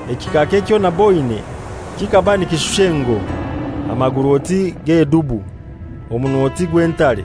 Ekikaaka ekyo naboine ekyo kikaba nikishusha engoi, amaguru oti g'edubu, omunwa oti gw'entare.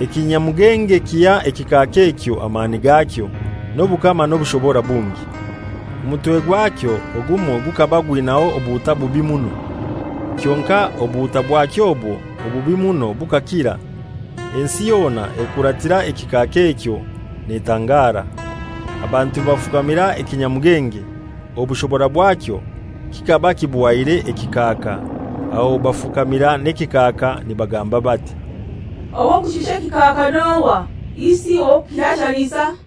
Ekinyamugenge kiha ekikaaka ekyo amani gakyo, n'obukama n'obushobora bungi. Omutwe gwakyo ogumoi gukaba gwinaho obuhuta bubi muno, kyonkai obuhuta bwakyo obwo obubi muno bukakira. Ensi yona ekuratira ekikaaka ekyo netangara. Abantu bafukamira ekinyamugenge. Obushobora bwakyo kikaba kibuhaire ekikaaka, aho bafukamira n'ekikaaka nibagamba bati, «Ow'okushusha ekikaaka n'ohai? Isi ow'okukirashanisa?»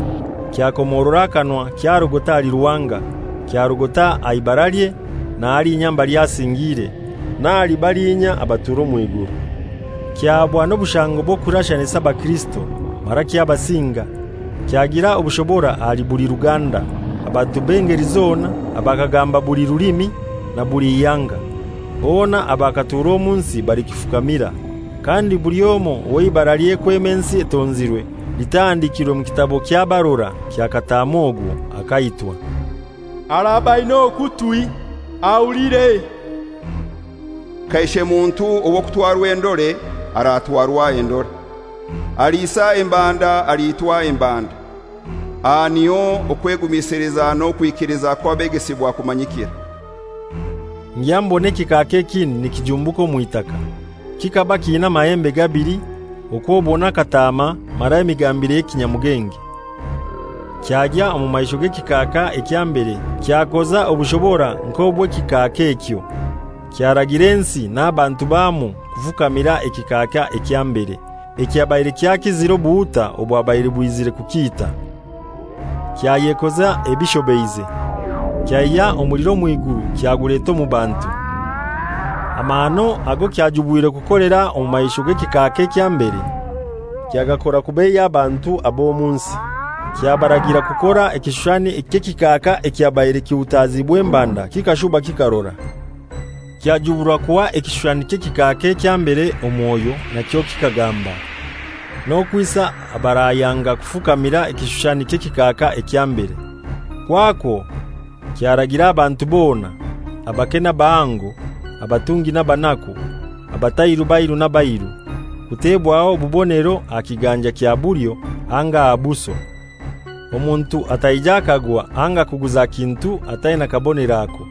Kyakomorora akanwa kyarogota ahali Ruhanga, kyarogota aha ibaralye na halinya mbali asingiire, n'ahali balinya abatura omw'iguru. Kyahabwa n'obushango bw'okurashanisa abakirisito, mara kyabasinga. Kyagira obushobora ahali buli ruganda, abantu b'engeli zona, abakagamba buli rulimi, na buli ihanga. Bona abakatura omu nsi balikifukamira. Kandi buli omoi ow'eibaralye kwema ensi etonzirwe litahandikirwe mu kitabo ky'abarora kya Kataama ogwo akaitwa. Araba aina okutwi ahulire: Kaishe muntu ow'okutwarwa endore aratwarwa endore. Aliisa embanda aliitwa embanda. Aha niho okwegumisiliza n'okwikiliza kw'abegesibwa kumanyikira. Ngya mbona ekikaaka ekindi nikijumbuka omw'itaka. Kikaba kiina amahembe gabili okw'obona akataama mara emigambire y'ekinyamugenge. Kyagya omu maisho g'ekikaaka ekya mbere kyakoza obushobora nk'obw'ekikaaka ekyo, kyaragira ensi n'abantu bwamwo kufukamira ekikaaka ekya mbere, ekyabaire kyakizire obuhuta obwabaire bwizire kukiita. Kyayekoza ebishobeize: Kyaihya omuliro omw'iguru kyaguleta omu bantu. Amahano ago kyajubwirwe kukolera omu maisho g'ekikaaka ekya mbere, kyagakora kubeiya abantu ab'omu nsi, kyabaragira kukora ekishushani eky'ekikaaka ekyabaire kihutaziibwe embanda kikashuba kikarora. Kyajuburwa kuha ekishushani ky'ekikaaka ekya mbere omwoyo nakyo kikagamba, n'okwisa abarayanga kufukamira ekishushani ky'ekikaaka ekya mbere. Kwakwo kyaragira abantu bona, abake n'abahango, abatungi n'abanaku, abatali bairu n'abairu kutebwaho obubonero aha kiganja kya bulyo anga aha buso, omuntu ataija akagwa anga kuguza kintu ataina kabonero ako,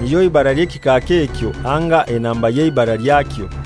nilyo ibara ly'ekikaaka ekyo anga enamba y'eibara lyakyo.